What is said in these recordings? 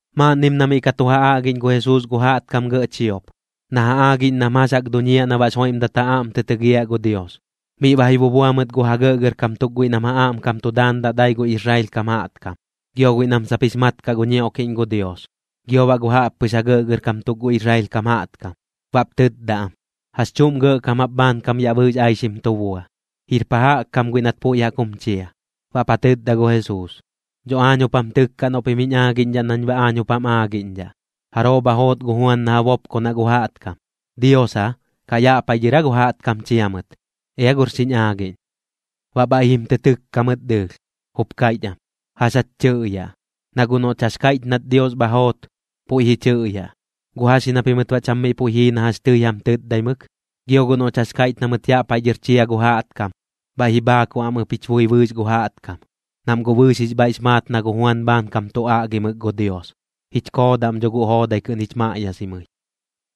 Maaꞌnnim na miꞌ ka tu ja aꞌgiꞌñ gu Jesuus gu jaꞌtkam gɇꞌ chiop, na ja aagiꞌñ nam jax jaꞌk duñiaꞌ na baꞌx joiꞌmdat ja aꞌm tɨ tɨgiaꞌ gu Dios, miꞌ ba ji bubua mɨt gu ja gɇꞌgɇrkam tuk guiꞌ nam ja aꞌmkam tu daandaꞌ dai gu Israel kam jaꞌtkam, gio guiꞌ nam sap jix mat kaꞌ gu ñioꞌkiꞌñ gu Dios, gio baꞌ gu jaꞌppɨx ja gɇꞌgɇrkam tuk gu Israel kam jaꞌtkam. Baꞌp tɨtda am: ―¿Jax chuꞌm gɇꞌkam jap bhaankam yaꞌ bɨɨx aixim tu bua? ¿Jir pa jaꞌk kam guiꞌ nat puiꞌ jaꞌk jum chia? Baꞌp ja tɨtda gu Jesuus: ―Dho aañ jup jam tɨkkaꞌ noꞌ pim jiñ aagiꞌñdhaꞌ nañ baꞌ aañ jup jam aagiꞌñdhaꞌ. ¿Jaroo bha joot gu Juan na ja bopkonaꞌ gu jaꞌtkam? ¿Dios aa, kaꞌ yaꞌ paiꞌ dhɨr aa gu jaꞌtkam chia mɨt? Ea gor xiñ aagiꞌñ. Baꞌ bhaiꞌ jim tɨ tɨkka mɨt dɨɨlh, jup kaiꞌch am: ―¿Jax jach tɨꞌyaꞌ? Na guꞌ noꞌch jax kaiꞌch nat Dios bha joot, puiꞌ ji chɨꞌyaꞌ: “¿Guꞌ jax ji na pimɨt baꞌ cham miꞌ puiꞌ jii na jax tɨi jam tɨtdaimɨk?” Gio guꞌ noꞌch jax kaiꞌch na mɨt yaꞌ paiꞌ dhɨr chia gu jaꞌtkam, bhaiꞌ ji bhaakuꞌ am ɨp jich bui bɨɨx gu jaꞌtkam, nam guꞌ bɨɨx jix bhaiꞌx maat na gu Juan bhaankam tu aꞌgimɨk gu Dios. Jich koodaꞌm dho guꞌ joodai kɨꞌn jich maꞌyasimɨi.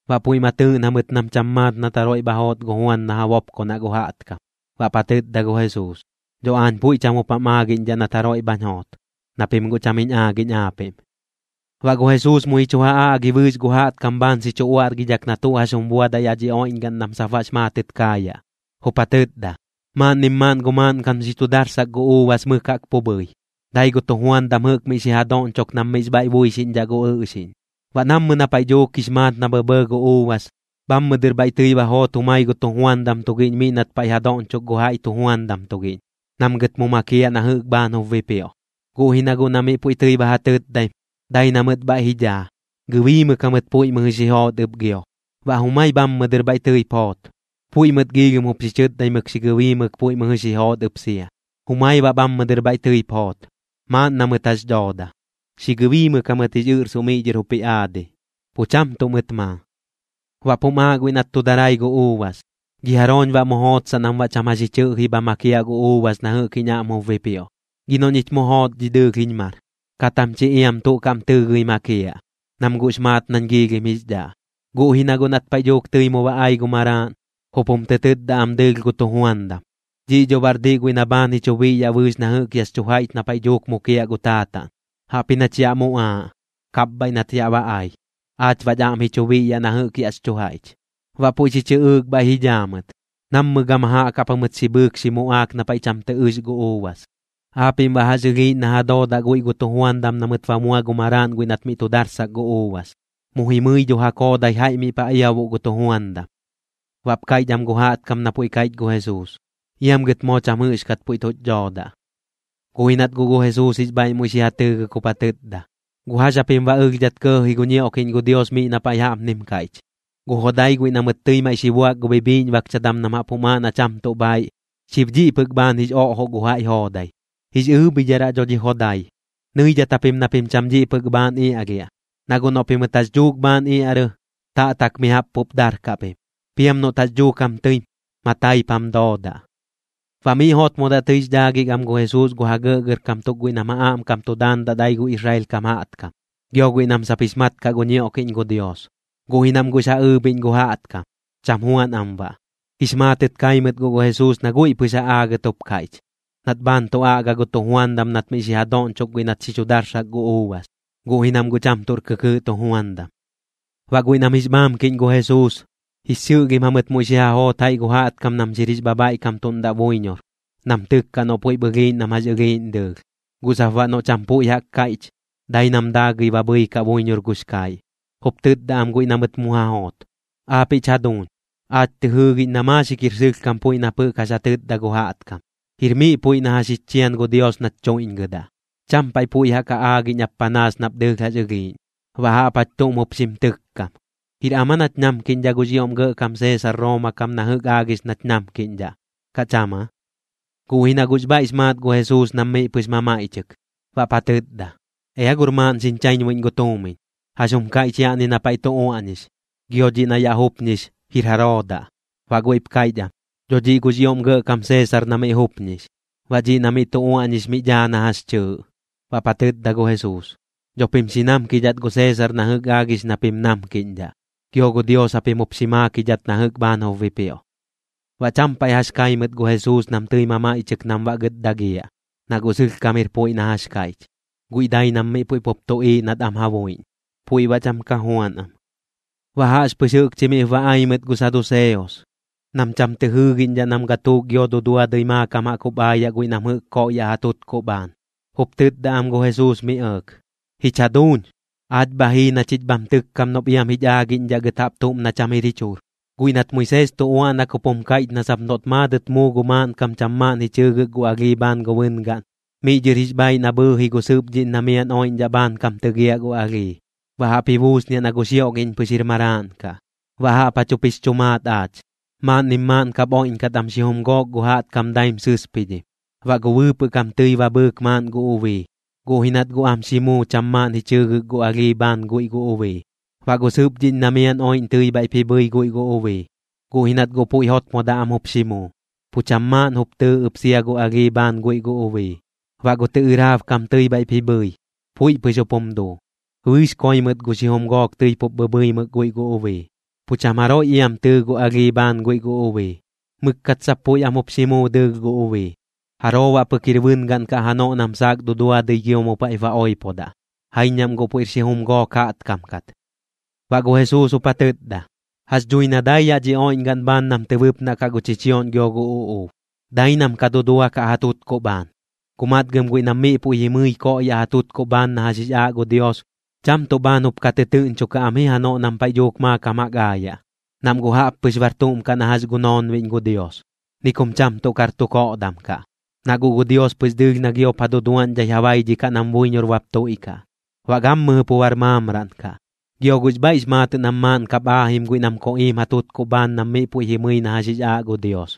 Baꞌ puiꞌ ma tɨɨꞌn jamɨt nam cham maat nat jaroiꞌ bha joot gu Juan na ja bopkonaꞌ gu jaꞌtkam. Baꞌp ja tɨtda gu Jesuus: ―Dho aañ puiꞌ cham jup jam aagiꞌñdhaꞌ nat jaroiꞌ bhañ joot, na pim guꞌ cham jiñ aagiꞌñ aapiꞌm. Baꞌ gu Jesuus muiꞌ ji chu ja aꞌgi bɨɨx gu jaꞌtkam bhaan xi chu uaꞌrgidhak na tuꞌ jax jum buadaꞌ yaꞌ dhi oiꞌñgaꞌn nam sap baꞌx maatɨt kaayaꞌ. Jup ja tɨtda: ―Maaꞌnnim maaꞌn gu maaꞌnkam xi chu darsak gu uubas mɨk jaꞌk pu bhɨi, dai gu tujuandam jɨꞌk miꞌ xi ja doꞌñchok nam miꞌx bhaiꞌ buixiꞌñdhaꞌ gu ɨꞌxiꞌñ. Baꞌ nammɨ na paiꞌ dhuuk jix maat na bhɇbhɇɇ gu uubas, bhammɨ dɨr bhaiꞌ tɨi ba joot jumai gu tujuandam tugiꞌñ miꞌ nat paiꞌ ja doꞌñchok gu jaiꞌ tujuandam tugiꞌñ, nam gɨt mu makiaꞌ na jɨꞌk bhaan jup bipioꞌ. Guꞌ ji na guꞌ na miꞌ puiꞌ tɨi ba ja tɨtdaim, dai na mɨt bhaiꞌ ji dhaa, gɨbiimɨk jamɨt puiꞌ mɨjɨ xi joot ɨp gio. Baꞌ jumai bhammɨ dɨr bhaiꞌ tɨip joot. Puiꞌ mɨt giilhim jup xi chɨtdaimɨk xi gɨbiimɨk puiꞌ mɨjɨ xi joot ɨp sia. Jumai baꞌ bhammɨ dɨr bhaiꞌ tɨip joot. Maaꞌn na mɨt jax dhooda, xi gɨbiimɨk jamɨt jix ɨꞌrsuꞌ miꞌ dhɨr jup ji aadi, pu cham tuꞌ mɨt maa. ’Baꞌp jum aaꞌ guiꞌ nat tu darai gu uubas: “¿Gi jarooñ baꞌ mu jootsaꞌ nam baꞌ cham jax ji chɨꞌji bha makiaꞌ gu uubas na jɨꞌk jiñ aꞌm jup bipioꞌ? Gi noꞌ ñich mu joot dhi dɨɨlh jiñ mar, kat jam chi iam tuꞌ kaꞌm tɨɨgɨi makiaꞌ, nam guꞌx maat nañ giilhim jix dhaꞌ.” Guꞌ ji na guꞌ nat paiꞌ dhuuk tɨi mu ba ai gu maraaꞌn, jup jum tɨ tɨtda am dɨɨlh gu tujuandam: “Dhiꞌ dho baꞌr diꞌ guiꞌ na bhaan ji chu biꞌyaꞌ bɨɨx na jɨꞌk yaꞌx chu jaiꞌch na paiꞌ dhuuk mukiaꞌ gu taataꞌn. Jaꞌpji nach yaꞌ muꞌaaꞌ, kapbhaiꞌ nat yaꞌ ba ai. Aach baꞌch aꞌm ji chu biꞌyaꞌ na jɨꞌk yaꞌx chu jaiꞌch.” Baꞌ puiꞌ xi chɨꞌɨɨk bhaiꞌ ji dhaa mɨt. Nammɨ gama jaꞌk jaꞌp jamɨt xi bhɨɨk xi muꞌaak na paiꞌ cham tɨ ɨx gu uubas. ¿Aapiꞌm baꞌ jax ɨlhiiꞌñ na ja doodaꞌ guiꞌ gu tujuandam na mɨt ba mua gu maraaꞌn guiꞌ nat miꞌ tu darsak gu uubas? Mu jimɨi dho ja koodai jaiꞌp miꞌ ja iabuꞌ gu tujuandam. Baꞌp kaiꞌch am gu jaꞌtkam na puiꞌ kaiꞌch gu Jesuus: ―¡Iam gɨt moo cham jɨꞌxkat puiꞌ tuch dhoodaꞌ! Guꞌ ji nat guꞌ gu Jesuus jix bhaiꞌ muiꞌ xi ja tɨɨgɨk jup ja tɨtda: ―¿Guꞌ jax japim baꞌ ɨlhdhat kɇɇ ji gu ñioꞌkiꞌñ gu Dios miꞌ na paiꞌ jaꞌpnim kaiꞌch?: Gu jodai guiꞌ na mɨt tɨi maiꞌ xi buak gu bhibhiꞌñbakchadam nam jup jum aaꞌ na cham tuꞌ bhaiꞌ, xib dhiꞌ pɨk bhaan jix oꞌjoꞌ gu jaiꞌ joodai. Jix ɨɨbhidharaꞌ dho dhi jodai. Nɨidhat japim na pim cham dhiꞌ pɨk bhaan iaꞌlhiaꞌ. Na guꞌ noꞌ pimɨt jax dhuuk bhaan iaꞌrɨ, taꞌtak mi jaꞌp pup darkaꞌ pim. Piam noꞌt jax dhuuk jam tɨim, mataip jam doodaꞌ. Baꞌ miꞌ jotmodaꞌ tɨix dhaagɨk am gu Jesuus gu ja gɇꞌgɇrkam tuk guiꞌ nam ja aꞌmkam tu daandaꞌ dai gu Israel kam jaꞌtkam, gio guiꞌ nam sap jix mat kaꞌ gu ñioꞌkiꞌñ gu Dios, guꞌ ji nam guꞌx ja ɨɨbhiꞌñ gu jaꞌtkam, cham juan am baꞌ. Jix maatɨt kai mɨt guꞌ gu Jesuus na guiꞌ pɨx ja aagɨt jup kaiꞌch, nat bhaan tu aꞌga gu tujuandam nat miꞌ xi ja doꞌñchok guiꞌ nat xi chu darsak gu uubas, guꞌ ji nam guꞌ cham tuꞌr kɨkɨɨꞌ tujuandam. Baꞌ guiꞌ nam jix bhaamkiꞌñ gu Jesuus, jix xɨꞌlhim jamɨt muiꞌ xi ja joot jaiꞌ gu jaꞌtkam nam xir jix bhabhaiꞌkamtuꞌndaꞌ buiñor, nam tɨkkaꞌ noꞌ puiꞌp ɨlhiiꞌñ nam jax ɨlhiiꞌñ dɨɨlh. Guꞌ sap baꞌ noꞌ cham puiꞌ jaꞌk kaiꞌch, dai nam daagɨi ba bhɨikaꞌ buiñor gux kaiꞌ. Jup tɨtda am guiꞌ na mɨt mu ja joot: ―Aapiꞌch jaduuñ, aach tɨ jɨɨgiꞌñ na maaxik jir sɨlhkam puiꞌ nap jɨꞌk jax ja tɨtda gu jaꞌtkam. Jir miꞌ puiꞌ na jax jich chian gu Dios nach chuiꞌñgɨdaꞌ, cham paiꞌ puiꞌ jaꞌk ja aagiꞌñ ap panaas nap dɨɨlh jax ɨlhiiꞌñ. Baꞌ jaꞌp jach tuꞌm jup xim tɨkkam: ¿Jir am aa nach namkiꞌñdhaꞌ gux ioꞌm gɇꞌkam Seesar Rooma kam na jɨꞌk aagix nach namkiꞌñdhaꞌ, kaꞌ cham aa? Guꞌ ji na guꞌx bhaiꞌx maat gu Jesuus nam miꞌ pɨx mamaiꞌchɨk, baꞌp ja tɨtda: ―Ea gor maaꞌn xiñ chaiñbuiꞌñ gu tuumiñ. ¿Jax jum kaiꞌch yaꞌni na paiꞌ tu uaꞌñix, gio dhiꞌ na yaꞌ jupñix, jir jaroo daꞌ? Baꞌ guiꞌp kaiꞌch am: ―Dho dhiꞌ gux ioꞌm gɇꞌkam Seesar na miꞌ jupñix, baꞌ dhiꞌ na miꞌ tu uaꞌñix miꞌ dhaa na jax chɨɨꞌ. Baꞌp ja tɨtda gu Jesuus: ―Dho pim xi namkidhat gu Seesar na jɨꞌk aagix na pim namkiꞌñdhaꞌ, gio gu Dios japim jup xi maakidhat na jɨꞌk bhaan jup bipioꞌ. Baꞌ cham paiꞌ jax kai mɨt gu Jesuus nam tɨi mamaiꞌchɨk nam baꞌ gɨt dagiaꞌ, na guꞌ sɨlhkam jir puiꞌ na jax kaiꞌch. Guiꞌ dai nam miꞌ puiꞌ pup tuꞌiiꞌ nat am ja buiꞌñ, puiꞌ baꞌ cham ka juan am. Baꞌ jaꞌxpɨx jɨꞌkchi miꞌp ba ai mɨt gu saduseos, nam cham tɨ jɨɨgiꞌñdhaꞌ nam gatuuk gio duduadɨi maakam jaꞌk jup aayaꞌ guiꞌ nam jɨꞌk koꞌyaꞌ ja tutkuꞌ bhaan. Jup tɨtda am gu Jesuus mi ɇɇk: ―Jich jaduuñ, aach bha jii na chich bham tɨkkam noꞌp iam jich aagiꞌñdhaꞌ gɨt jaꞌp tuꞌm na cham jir jich jur. Guiꞌ nat Moisees tu uaꞌnak jup jum kaiꞌch na sap noꞌt maadɨt muu gu maaꞌnkam cham maaꞌn ji chɨɨgɨk gu alhii bhaan gu bɨngaꞌn, miꞌ dhɨr jix bhaaiꞌ na bhɨɨji gu sɨpdhiꞌñ na miaꞌn oiꞌñdhaꞌ bhaankam tɨgiaꞌ gu alhii, baꞌ jaꞌp ji buusniaꞌ na gu xioꞌgiꞌñ pɨx jir maraaꞌn kaꞌ. Baꞌ jaꞌp jach jup jix chu maat aach. Maaꞌnnim maaꞌn kap oiꞌñkat am xijum gook gu jaꞌtkam daim sɨspidhim. Baꞌ gu bɨɨpɨꞌ kam tɨi ba bhɨɨk maaꞌn gu ubii, guꞌ ji nat guꞌ am xi muu cham maaꞌn ji chɨɨgɨk gu alhii bhaan guiꞌ gu ubii. Baꞌ gu sɨpdhiꞌñ na miaꞌn oiꞌñ tɨi bhaiꞌp ji bhɨi guiꞌ gu ubii, guꞌ ji nat guꞌ puiꞌ jotmodaꞌ am jup xi muu, pu cham maaꞌn jup tɨɨ ɨp sia gu alhii bhaan guiꞌ gu ubii. Baꞌ gu tɨꞌɨraab kam tɨi bhaiꞌp ji bhɨi, puiꞌ pɨx jup jum duu. Bɨɨx koi mɨt gu xijum gook tɨi pup bhɨbhɨimɨk guiꞌ gu ubii, pu cham jaroiꞌ iam tɨɨ gu alhii bhaan guiꞌ gu ubii. Mɨkkat sap puiꞌ am jup xi muu dɨɨlh gu ubii. ¿Jaroo baꞌ pɨk jir bɨngaꞌn kaꞌ janoꞌ nam saak duduadɨi gio mu paiꞌp ba oipodaꞌ? Jaiñ nam guꞌ puiꞌr xijum gook jaꞌtkam kat. Baꞌ gu Jesuus jup ja tɨtda: ―Jax dhui na dai yaꞌ dhi oiꞌñgaꞌn bhaan nam tɨ bɨpnaꞌ kaꞌ gu chichioꞌñ gio gu uꞌuub, dai nam ka duduakaꞌ ja tutkuꞌ bhaan. Guꞌ matgɨm guiꞌ nam miꞌ puiꞌ jimɨi koꞌyaꞌ ja tutkuꞌ bhaan na jax jix aaꞌ gu Dios, cham tuꞌ bhaan jup ka tɨtɨɨꞌñchokaꞌm ji janoꞌ nam paiꞌ dhuuk maakam jaꞌk aayaꞌ, nam guꞌ jaꞌp pɨx bar tuꞌm kaꞌ na jax gu noonbiꞌñ gu Dios. Ni kum cham tuꞌ kar tu koꞌdam kaꞌ, na guꞌ gu Dios pɨx dɨɨlh na giop ja duduaꞌñdhai ja baidhikaꞌ nam buiñor bap tuiꞌkaꞌ, baꞌ gammɨjɨ pu bar maamraꞌn kaꞌ. Gio guꞌx bhaiꞌx maatɨꞌ nam maaꞌn kap aajim guiꞌ nam koꞌiim ja tutkuꞌ bhaan nam miꞌ puiꞌ jimɨi na jax jix aaꞌ gu Dios.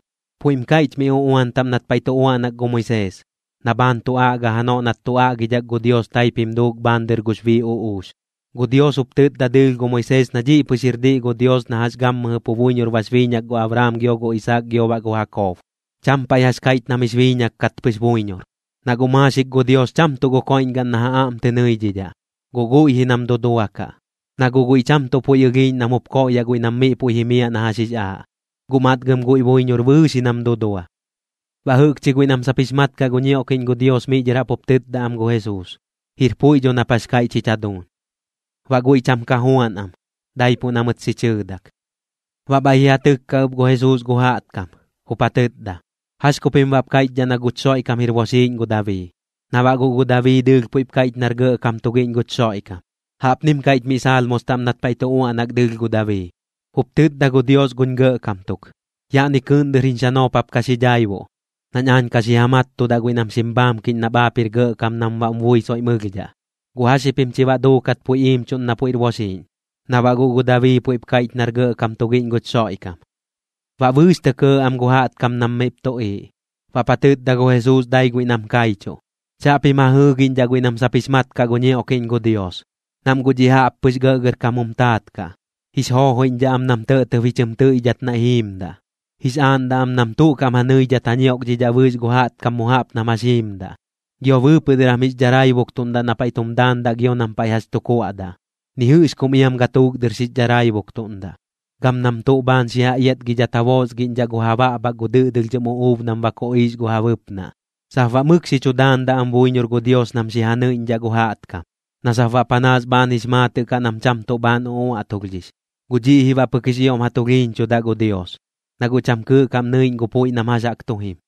Puiꞌm kaiꞌch mi uꞌuan taꞌm nat paiꞌ tu uaꞌnak gu Moisees, na bhaan tu aꞌga janoꞌ nat tu aꞌgidhak gu Dios taip jim duuk bhaan dɨr gux bii uꞌuux. Gu Dios jup tɨtda dɨɨlh gu Moisees na dhiꞌ pɨx jir diꞌ gu Dios na jax gammɨjɨ pu buiñor bax biiñak gu Abraam gio gu Isaak gio baꞌ gu Jakob, cham paiꞌ jax kaiꞌch nam jix biiñak kat pɨx buiñor. Na guꞌ maaxik gu Dios cham tuꞌ koiꞌñgaꞌn na ja aꞌm tɨ nɨidhidhaꞌ, guꞌ guiꞌ ji nam duduakaꞌ. Na guꞌ guiꞌ cham tuꞌ puiꞌ ɨlhiiꞌñ nam jup koꞌyaꞌ guiꞌ nam miꞌ puiꞌ jimiaꞌ na jax jix aaꞌ, guꞌ matgɨm guiꞌ buiñor bɨɨx ji nam dudua. Baꞌ jɨꞌkchi guiꞌ nam sap jix mat kaꞌ gu ñioꞌkiꞌñ gu Dios miꞌ dhɨr jaꞌp jup tɨtda am gu Jesuus: ―Jir puiꞌ dho nap jax kaiꞌch jich jaduuñ. Baꞌ guiꞌ cham ka juan am, daipuꞌ na mɨt xi chɨɨdak. Baꞌ bhaiꞌ ji ja tɨkka ɨp gu Jesuus gu jaꞌtkam, jup ja tɨtda: ―¿Jax ku pim baꞌp kaiꞌchdhaꞌ na guch Xoiꞌkam jir boxiiꞌñ gu Dabii? Na baꞌ guꞌ gu Dabii dɨɨlh puiꞌp kaiꞌch nar gɇꞌkam tugiꞌñ guch Xoiꞌkam. Jaꞌpnim kaiꞌch mi Salmos taꞌm nat paiꞌ tu uaꞌnak dɨɨlh gu Dabii: Jup tɨtda gu Dios guñ gɇꞌkam tuk: “Yaꞌni kɨɨꞌn dɨr jiñ xanoop jap ka xi dhaibuꞌ nañ aañ ka xi ja mattudaꞌ guiꞌ nam xim bhaamkiꞌñ nap aap jir gɇꞌkam nam baꞌm bui soiꞌm ɨlhdhaꞌ.” ¿Guꞌ jax ji pim chi baꞌ duukat puiꞌ iimchuꞌn na puiꞌr boxiiꞌñ, na baꞌ guꞌ gu Dabii puiꞌp kaiꞌch nar gɇꞌkam tugiꞌñ guch Xoiꞌkam? Baꞌ bɨɨx tɇ kɇɇ am gu jaꞌtkam nam miꞌp tuꞌiiꞌ. Baꞌp ja tɨtda gu Jesuus dai guiꞌ nam kaichuꞌ: ―Chaꞌpim ja jɨɨgiꞌñdhaꞌ guiꞌ nam sap jix mat kaꞌ gu ñioꞌkiꞌñ gu Dios, nam guꞌ dhiꞌ jaꞌppɨx gɇꞌgɇrkam jum taat kaꞌ. Jix joojoiꞌñdhaꞌ am nam tɇꞌtɇb ji chɨm tɨiꞌdhat naiꞌ jiimdaꞌ, jix aaꞌndaꞌ am nam tuꞌ kaꞌm ja nɨidhat ja ñioꞌkdhidhaꞌ bɨɨx gu jaꞌtkam mu jaꞌp nam jax jiimdaꞌ. Gio bɨɨpɨꞌ dɨr jam jix dharaibuktuꞌndaꞌ na paiꞌ tum daandaꞌ gio nam paiꞌ jax tu kuaꞌdaꞌ, ni jɨꞌx kum iam gatuuk dɨr xix dharaibuktuꞌndaꞌ. Gam nam tuꞌ bhaan xi ja iatgidhat ja boosgiꞌñdhaꞌ gu ja baꞌbhak gu dɨꞌdɨlhdhɨm uꞌuub nam ba koꞌiix gu ja bɨpnaꞌ, sap baꞌ mɨk xi chu daandaꞌ am buiñor gu Dios nam xi ja nɨiꞌñdhaꞌ gu jaꞌtkam, na sap baꞌ panaas bhaan jix maatɨꞌ kaꞌ nam cham tuꞌ bhaan uꞌuaꞌtulhdhix. Guꞌ dhiꞌ ji baꞌ pɨk jix ioꞌm ja tulhiiñchudaꞌ gu Dios, na guꞌ cham kɨɨꞌ kaꞌm nɨiꞌñ gu puiꞌ nam jax jaꞌk tu jim.